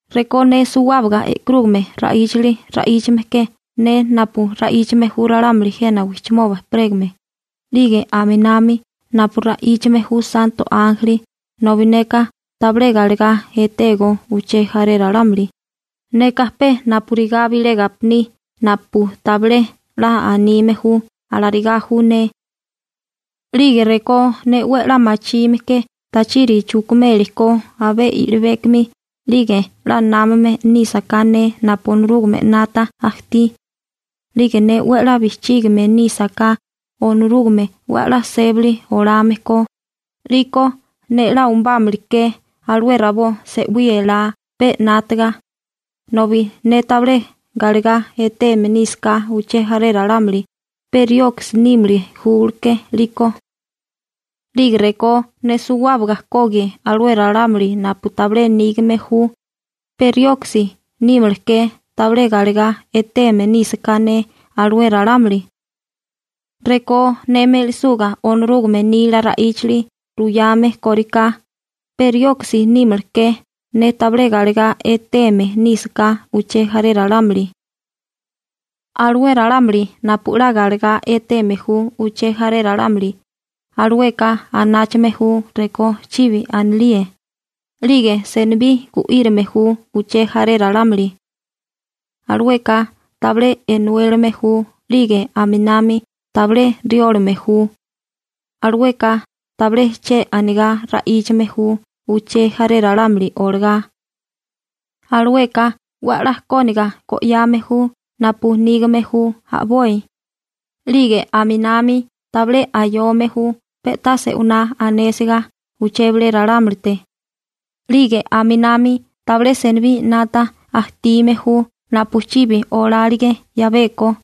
Rekó ne suwábaga e'karúgame ra'íchali ra'íchame ke ne napu ra'íchame ju ralámuli jena wijchimoba ejperégame 'lige aminami napu ra'íchame ju santo ánjeli nobi neka tabilé galegá etégó uché jaré ralámuli, neka pe napurigá bilé gapiní napu tabilé 'la anime ju, alarigá ju ne. 'Lige rekó ne 'we 'la machime ke tachiri chukumeli ko abé i'libékomi 'lige 'la námame nísaká ne napu Onorúgame 'nata ajtí, 'lige ne 'we 'la bijchígame nísaká Onorúgame 'we 'la sébali olame ko, 'liko ne 'la umubámili ke alué rabó se'wí elá pe 'nátaga, ne tabilé galegá eteme nísaká uché jaré ralámuli, pe rioksi nímili ke 'liko. 'Lige rekó ne suwábaga kogie alué ralámuli napu tabilé nígame ju, pe rioksi nímala ke tabilé galegá eteme nísaká ne alué ralámuli. Rekó ne me'lisuga Onorúgame nila ra'íchali ruyame kóriká, pe rioksi nímala ke, ne tabilé galegá eteme nísaká uché jaré ralámuli. Alué ralámuli napu 'la galegá eteme ju uché jaré ralámuli, alueka anáchame ju rekó chibi anilíe, 'lige senibí gu'írame ju uché jaré ralámuli. Alueka tabilé enuélame ju 'lige aminami tabilé riólame ju. Alueka tabilé che anigá ra'íchame ju uché jaré ralámuli olagá. Alueka 'we 'la kóniga go'yame ju napu nígame ju a'boi. 'Lige aminami tabilé ayome ju pe'tá se'winá anésiga uché bilé ralámulite. 'Lige aminami tabilé senibí 'nata ajtime ju napu chibi olálige 'yabeko.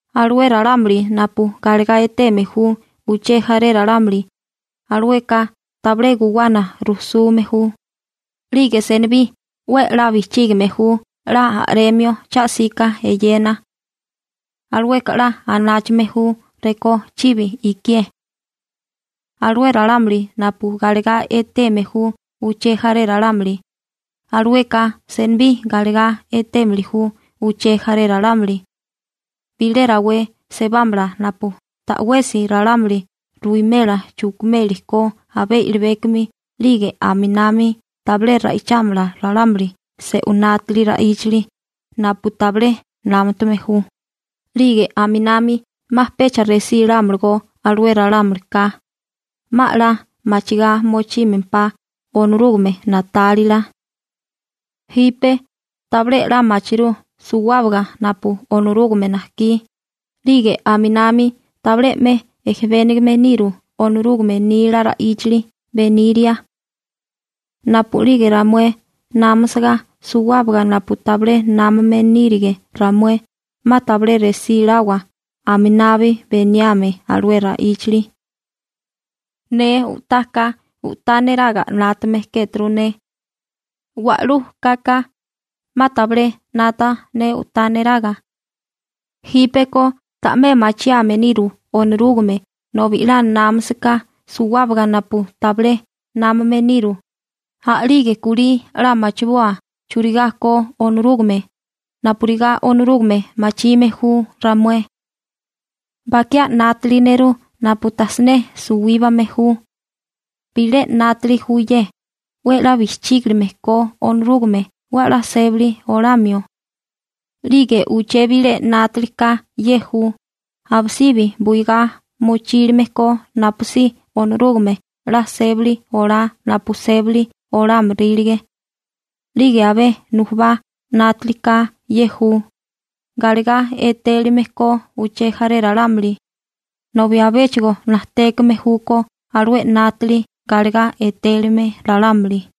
Alué ralámuli napu galegá eteme ju uché jaré ralámuli, alueka tabilé guwana rujsume ju, 'lige senibí 'we 'la bijchígime ju 'la a'remio cha'sika eyena. Alueka 'la anáchame ju rekó chibi ikié. Alué ralámuli napu galegá eteme ju uché jaré ralámuli, alueka senibí galegá etémili ju uché jaré ralámuli. Bilé rawé sebámala napu ta'wesi ralámuli ruwimela chukimeli ko abé i'libékomi 'lige aminami tabilé ra'ichámala ralámuli se'unátiri ra'íchali napu tabilé námutame ju, 'lige aminami 'ma pecha resílámalagó alué ralámulika, 'ma 'la machigá mochímempá Onorúgame na'tálila. Jipe tabilé 'la machirú suwábaga napu Onorúgame najkí, 'lige aminami tabilé 'me ejebénigame niru Onorúgame nila ra'íchali beniria. Napu'lige ramué námasiga suwábaga napu tabilé námame nírige ramué, 'ma tabilé resí lawa aminabi beniame alué ra'íchali. Ne u'tá ka, u'tá neraga 'nátame kéturu ne. Wa'lú kaka, 'ma tabilé 'nata ne u'tá neraga. Jípeko ta'mé machiame niru Onorúgame nobi 'la námasiká suwábaga napu tabilé námame niru, a'lige kulí 'la machiboa churigá ko Onorúgame, napurigá Onorúgame machime ju ramué. Bakiá 'nátali nerú napu tajsiné suwíbame ju. Bilé 'nátali ju ye: 'We 'la bijchígilime ko Onorúgame 'we 'la sébali olamio. 'Lige uché bilé 'nátali ka ye ju: Abisibi buigá mochílime ko napusí Onorúgame 'la sébali olá napu sébali olámorílige. 'Lige abé nujubá 'nátilika ye ju: galegá etélime ko uché jaré ralámuli. Nobi abéchigo najtékame júkó alué 'nátali galegá etélime ralámuli.